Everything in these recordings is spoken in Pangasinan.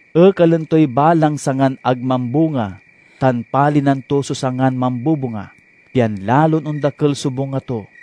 Ekalen toy balang sangan ag mambunga tan palinan to so sangan mambubunga, pian lalon ondakel so bunga to.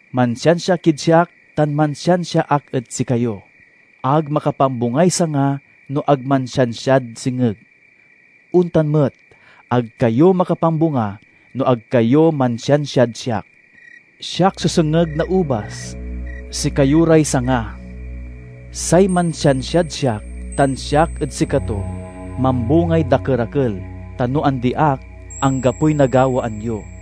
Mansiansia kid siak tan mansiansia ak ed sikayo. Ag makapambungay sanga no ag mansiansiad sengeg. Ontan met, ag kayo makapambunga no ag kayo mansiansiad siak. "Siak so sengeg na ubas, sikayo ray sanga. Say mansiansiad siak tan siak ed sikato, mambungay dakerakel. Ta no andi ak, anggapoy nagawaan yo.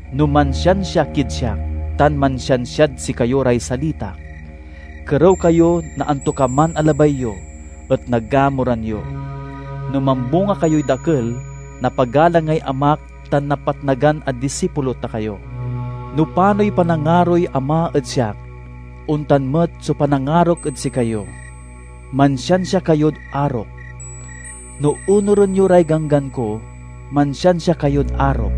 No mansiansia kid siak tan mansiansiad sikayo ray salitak, kerew kayo na antokaman a labay yo, et nagamuran yo. No mambunga kayoy dakel, napagalangay Amak tan napatnagan a disipulo ta kayo. No panoy panangaroy Ama ed siak, ontan met so panangarok ed sikayo; mansiansia kayod arok. No onuren yo ray ganggan ko, mansiansia kayod arok;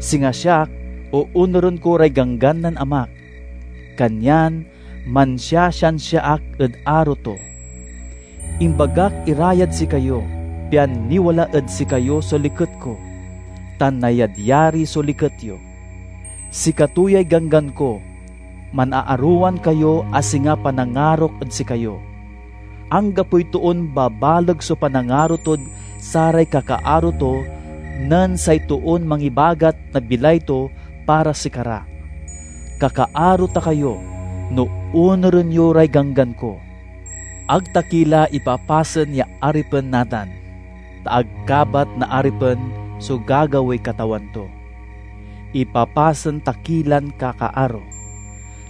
singa siak, oonuren ko ray ganggan nen Amak, kanyan mansiasiansia ak ed aro to. "Imbagak ira yad sikayo, pian niwala ed sikayo so liket ko, tan nayadyari so liket yo. Sikato yay ganggan ko: manaarowan kayo a singa panangarok ed sikayo. Anggapoy toon babaleg so panangaro tod saray kakaaro to nen say toon mangibagat na bilay to para sikara. Kakaaro ta kayo, no onuren yo ray ganggan ko. Ag ta ki la ipapasen ya aripen natan, ta ag kabat na aripen so gagawaey katawan to. Ipapasen ta ki lan kakaaro,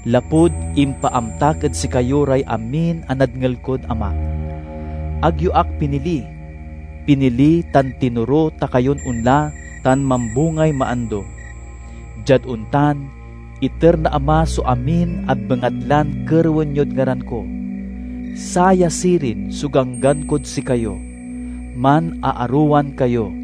lapud impaamtak ed sikayo ray amin a nadngel kod Amak. Ag yo ak pinili; pinili tan tinoro ta kayon onla tan mambungay maando. Diad ontan, iter na Ama so amin a bengatlan kerewen yod ngaran ko. Saya sirin so ganggan kod sikayo: manaarowan kayo."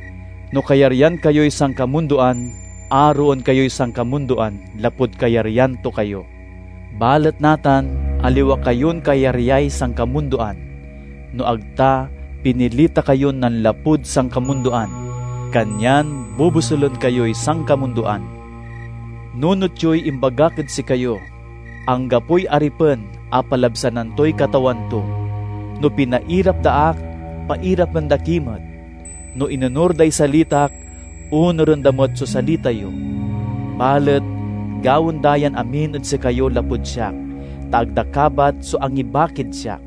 No kayaryan kayoy sankamundoan, aroen kayoy sankamundoan lapud kayaryan to kayo. Balet natan aliwa kayon kayaryay sankamundoan, no ag ta pinili ta kayon nanlapud sankamundoan, kanyan bobosulen kayoy sankamundoan. Nunot yoy imbagak ed sikayo: 'Anggapoy aripen a palabsanan toy katawan to.' No pinairap da ak, pairapen da ki met. No inonur day salitak, onuren da met so salita yo. Balet gawaen da yan amin ed sikayo lapud siak, ta ag da kabat so angibakid siak.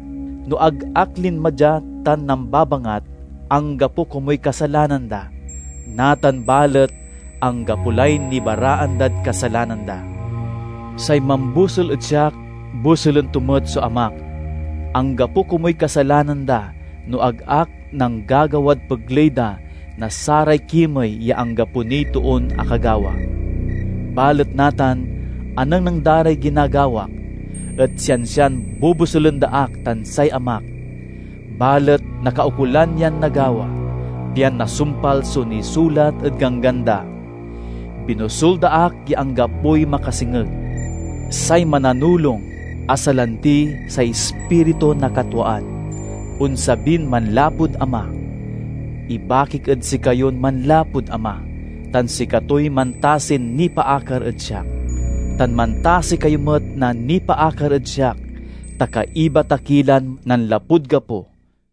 No ag ak linma dia tan nambabangat, anggapo komuy kasalanan da. Natan balet; anggapo lay nibaraan dad kasalanan da. Say mambosul ed siak, bosulen to met so Amak. Anggapo komuy kasalanan da no ag ak nanggagawad pegley da na saray kimey ya anggapo niy toon akagawa. Balet natan anengneng da ray ginagawak, et siansian bobosulen da ak tan say Amak. Balet nakaukolan yan nagawa, pian nasumpal so nisulat ed Ganggan da, 'Binosul da ak ya anggapoy makasengeg.' "Say Mananulong, a salanti say Ispiritu na katwaan, onsabin manlapud Ama. Ibakik ed sikayon manlapud Ama, tan sikatoy mantasin nipaakar ed siak. Tan mantasi kayo met na nipaakar ed siak, ta kaiba ta ki lan nanlapud gapo.